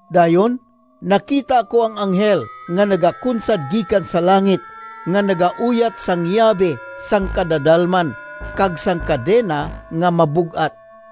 Dayon nakita ko ang anghel nga nagakunsad gikan sa langit nga nagauyat sang yabi sang kadadalman, kag sang kadena nga mabug-at.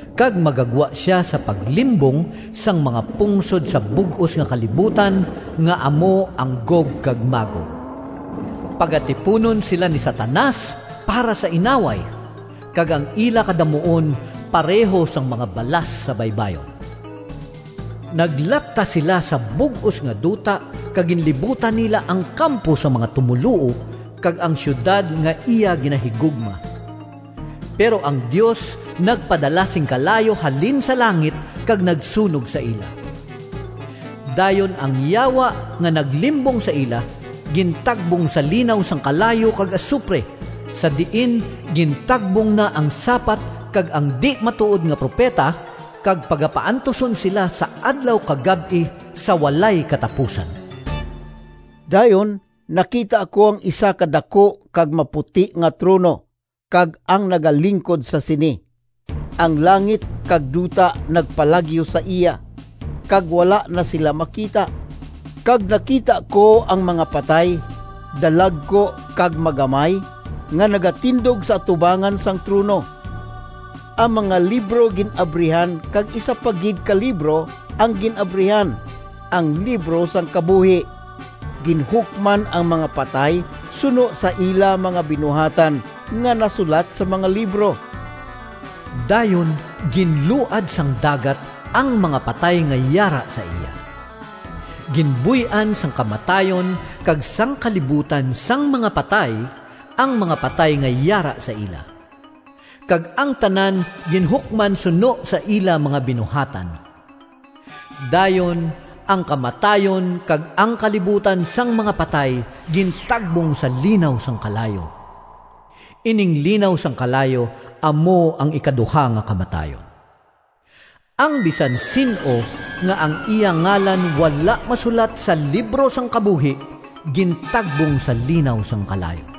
kag magagwa sia sa paglimbong sang mga pungsod sa bug-os nga kalibutan, nga amo ang Gog kag Magog. Pagatipunon sila ni Satanas para sa inaway, kag ang ila kadamuon pareho sang mga balas sa baybayon. Naglapta sila sa bug-os nga duta kag ginlibutan nila ang kampo sang mga tumoluo kag ang siyudad nga iya ginahigugma. Pero ang Dios nagpadala sing kalayo halin sa langit kag nagsunog sa ila. Dayon ang Yawa nga naglimbong sa ila, gintagbong sa linaw sang kalayo kag asupre, sa diin gintagbong na ang sapat kag ang di-matuod nga propeta, kag pagapaantuson sila sa adlaw kag gab-i sa walay katapusan. Dayon nakita ko ang isa ka daku kag maputi nga trono kag ang nagalingkod sa sini. Ang langit kag duta nagpalagyo sa iya, kag wala na sila makita. Kag nakita ko ang mga patay, dalagku kag magamay, nga nagatindog sa atubangan sang trono. Ang mga libro gin-abrihan kag isa pa gid ka libro ang gin-abrihan, ang libro sang kabuhi. Ginhukman ang mga patay suno sa ila mga binuhatan nga nasulat sa mga libro. Dayon ginluad sang dagat ang mga patay nga yara sa iya. Ginbuy-an sang kamatayon kag sang kalibutan sang mga patay ang mga patay nga yara sa ila. Kag ang tanan ginhukman suno sa ila mga binuhatan. Dayon ang kamatayon kag ang kalibutan sang mga patay gintagbong sa linaw sang kalayo. (Ining linaw sang kalayo amo ang ikaduha nga kamatayon.) Ang bisan sin-o nga ang iya ngalan wala masulat sa libro sang kabuhi gintagbong sa linaw sang kalayo.